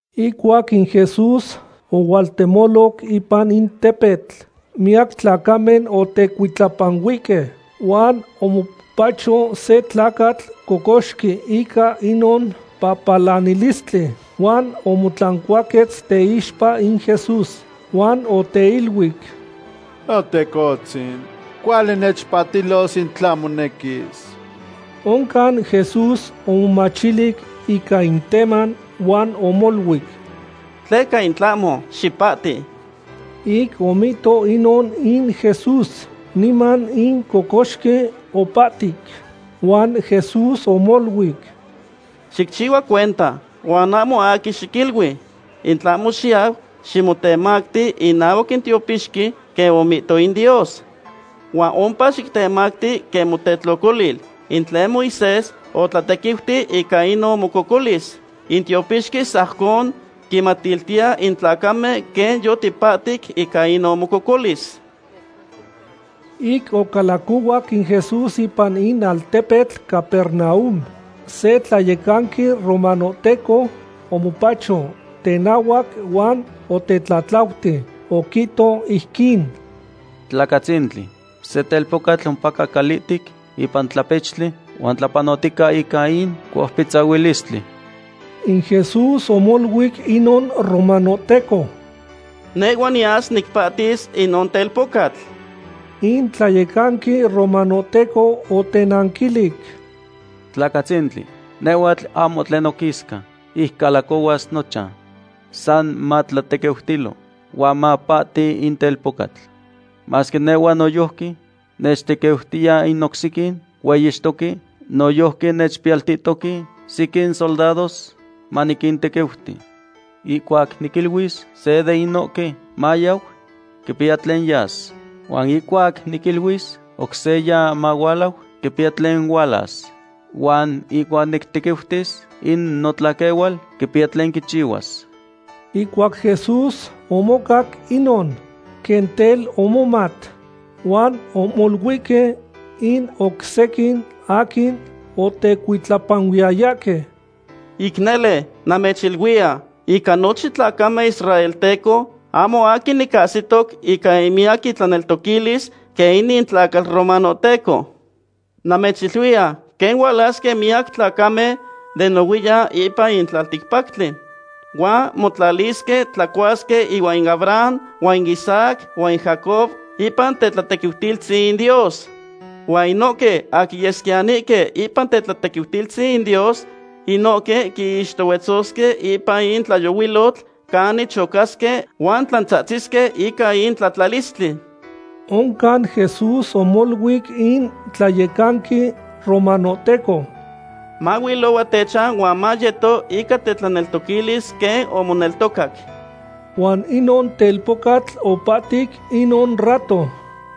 Ihcuac in Jesús ohualtemoloc ipan in tepetl, miyac tlacamen otecuitlapanuihque. Huan omopacho se tlacatl cocoxqui ica inon pahpalanilistli, huan omotlancuaquetz teixpa in Jesús, huan oteiluic: ―Notecohtzin, cuali nechpahtilos in tla monequis. Oncan Jesús omomachilic ica in teman huan omoluic: ―Tleca in tlahmo. Xipahti. Ic omihto inon in Jesús, niman in cocoxqui opahtic. Huan Jesús omoluic: ―Xicchihua cuenta, huan ahmo aquin xiquilui. In tlahmo xiyau ximotemacti inahuac in tiopixqui quen omihto in Dios. Huan ompa xitemacti quen motetlocolil in tlen Moisés otlatequiuti ica inon mococolis. In tiopixqui sajcon quinmatiltiya in tlacamen quen yotipahtic ica inon mococolis. Ic ocalacohuac in Jesús ipan in altepetl Capernaum, se tlayecanqui romanohteco omopacho tenahuac huan otetlatlauti. Oquihto ijquin: ―Tlacatzintli, se telpocatl ompaca calihtec ipan tlapechtli, huan tlapanotica ica in coupitzahuilistli. In Jesús omoluic inon romanohteco: ―Nehhua niyas nicpahtis inon telpocatl. In tlayecanqui romanohteco otenanquilic: ―Tlacatzintli, nehhuatl ahmo tlen noquisca ic calacohuas nochan. San matlatequiutilo huan mapahti in telpocatl. Masque nehhua noyojqui nechtequiutiya in oc sequin hueyixtoque, noyojqui nechpiyaltihtoque sequin soldados maniquintequiuti. Ihcuac niquiluis se de inohque mayau, quipiya tlen yas. Huan ihcuac niquiluis oc seya mahualau, quipiya tlen hualas. Huan ihcuac nictequiutis in notlaquehual, quipiya tlen quichihuas. Ihcuac Jesús omocac inon, quen tel omomat, huan omoluihque in oc sequin aquin otecuitlapanuiyayahque: ―Ic nele, namechiluiya, ica nochin tlacamen israelteco ahmo aquin nicahsitoc ica in miyac itlaneltoquilis quen inin tlacatl romanohteco. Namechiluiya quen hualasque miyac tlacamen den nohuiyan ipan in tlalticpactli, huan motlalisque tlacuasque ihuan in Abraham, huan Isaac, huan Jacob ipan tetlatequiutilistzin in Dios. Huan inohque aquin yesquiyanihque ipan tetlatequiutilistzin in Dios, inohque quinixtohuetzosque ipan in tlayohuilotl canin chocasque huan tlantzahtzisque ica in tlatlalistli. Oncan Jesús omoluic in tlayecanqui romanohteco: ―Mahuilohua techan huan mayeto ica tetlanequilis quen omoneltocac. Huan inon telpocatl opahtic inon rato.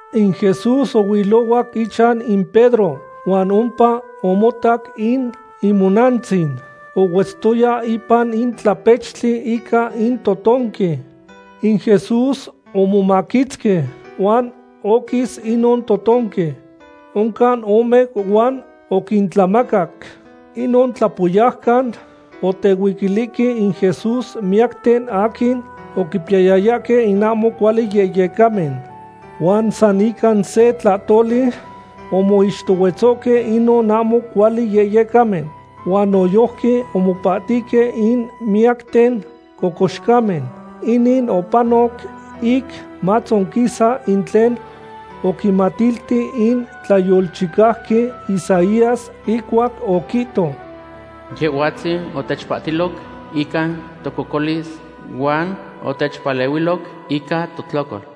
In Jesús ohuilohuac ichan in Pedro, huan ompa omotac in imonantzin ohuetztoya ipan in tlapechtli ica in totonqui. In Jesús omomaquitzqui, huan oquis inon totonqui. Oncan omeu huan oquintlamacac. Inon tlapoyaucan otehuiquilihque in Jesús miyacten aquin oquipiyayahque in ahmo cuali yehyecamen. Huan san ica se tlahtoli omoixtohuetzohque inon ahmo cuali yehyecamen, huan noyojqui omopahtihque in miyacten cocoxcamen. Inin opanoc ic matzonquisa in tlen oquinmatilti in tlayolchicauqui Isaías, ihcuac oquihto: “Yehhuatzin otechpahtiloc ica tococolis huan otechpalehuiloc ica totlocol.”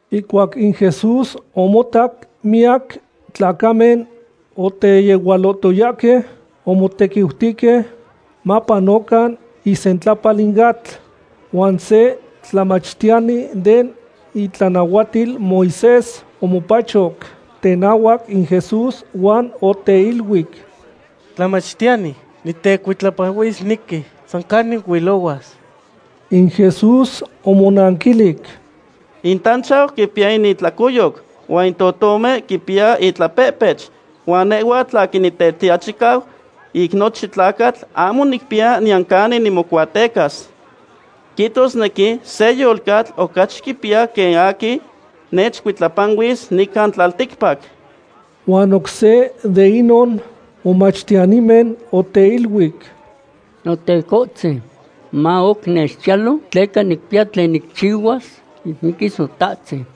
Ihcuac in Jesús omotac miyac tlacamen oteyehualohtoyahque, omotequiutihque mapanocan isentlapal in atl. Huan se tlamachtiyani den itlanahuatil Moisés omopachoc tenahuac in Jesús huan oteiluic: ―Tlamachtiyani, nitecuitlapanuisnequi san canic huilohuas. In Jesús omonanquilic: ―In tanchau quipiya in itlacoyoc huan in totomen quipiyahque intlapehpech, huan nehhuatl aquin Nitetiachicau ica nochin tlacatl ahmo nicpiya niyan canin nimocuatecas. Quihtosnequi se yolcatl ocachi quipiya quen in aquin nechcuitlapanuis nican tlalticpac. Huan oc se de inon momachtiyanimen oteiluic: ―Notecohtzin, ma oc nechchiyalo tleca nicpiya tlen nicchihuas ic miquis notatzin.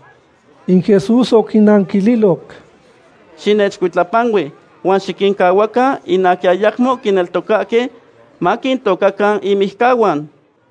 In Jesús oquinanquililoc: ―Xinechcuitlapanui, huan xiquincahuacan in aquin ayamo quineltocahque maquintocacan inmijcahuan.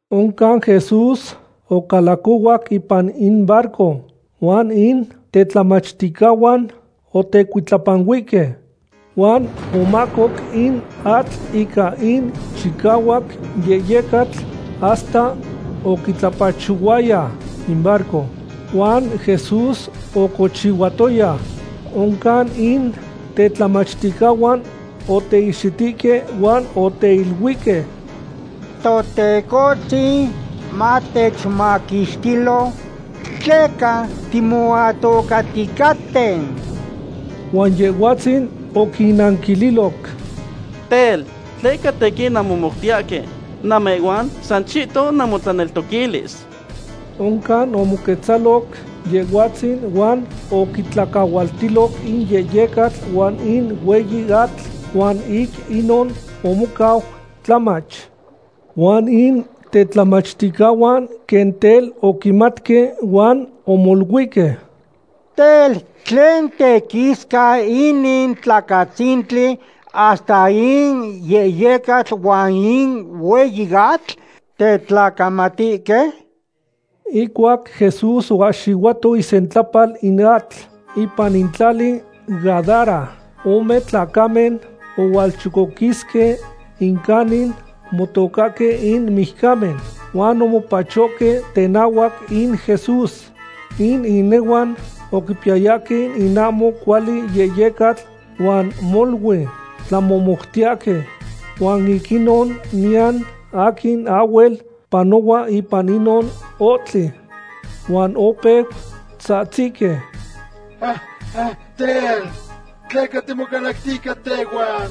Oncan Jesús ocalacohuac ipan in barco, huan in tetlamachticahuan otecuitlapanuihque. Huan omahcoc in atl ica in chicahuac yehyecatl hasta oquitlapachohuaya in barco. Huan Jesús ocochihuatoya. Oncan in tetlamachticahuan oteihxitihque huan oteiluihque: ―¡Totecohtzin, matechmaquixtilo, tleca timoatocahticaten! Huan Yehhuatzin oquinnanquililoc: ―Tel, ¿tleca tequin nanmomoutiyahque? ¡Namehhuan san chihton namotlaneltoquilis! Oncan omoquetzaloc Yehhuatzin huan oquitlacahualtiloc in yehyecatl huan in hueyi atl huan ic inon omocau tlamach. Huan in tetlamachticahuan quen tel oquimatque huan omoluihque: ―Tel, ¿tlen tequisca inin tlacatzintli, hasta in yehyecatl huan in hueyi atl tetlacamatihque? Ihcuac Jesús oahxihuato isentlapal in atl, ipan in tlali Gadara, ome tlacamen ohualchocoquisque in canin motocahque in mijcamen, huan omopachohque tenahuac in Jesús. In inehuan oquipiyayahque in ahmo cuali yehyecatl huan molui tlamohmoutiyahque. Huan ic inon niyan aquin ahhuel panohua ipan inon ohtli. Huan opeu tzahtzihque: ―Tel, ¿tleca timocalactiya ica tehhuan,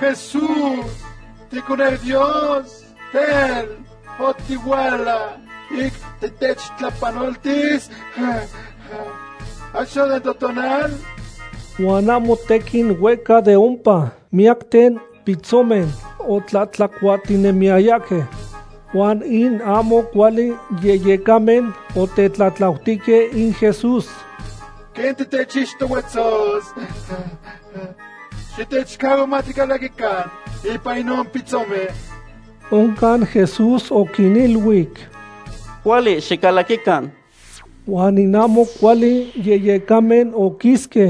Jesús, ticoneu Dios? Tel, ¿otihuala ic titechtlapanoltis achto den totonal? Huan ahmo tequin huehca de ompa miyacten pitzomen otlahtlacuahtinemiyayahque. Huan in ahmo cuali yehyecamen otetlatlautihque in Jesús: ―Quen titechixtohuetzos, xitechcahua maticalaquican ipan inon pitzomen. Oncan Jesús oquiniluic: ―Cuali xicalaquican. Huan in ahmo cuali yehyecamen oquisque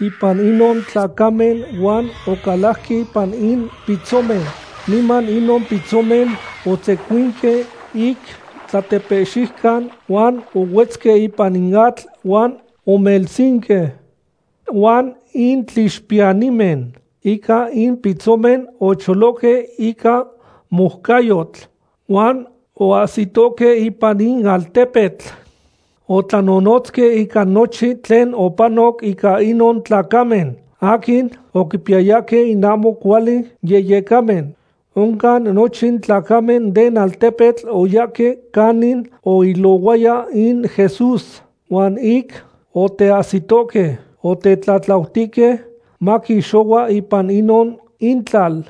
ipan inon tlacamen huan ocalajque ipan in pitzomen. Niman inon pitzomen otzecuinque ic tlatepehxiucan huan ohuetzque ipan in atl huan omelsinque. Huan in tlixpiyanimen ica in pitzomen ocholohque ica moucayotl, huan oahsitohque ipan in altepetl. Otlanonotzque ica nochin tlen opanoc ica inon tlacamen aquin oquipiyayahque in ahmo cuali yehyecamen. Oncan nochin tlacamen den altepetl oyahque canin oilohuaya in Jesús, huan ic oteahsitohque, otetlatlautihque maquixohua ipan inon intlal.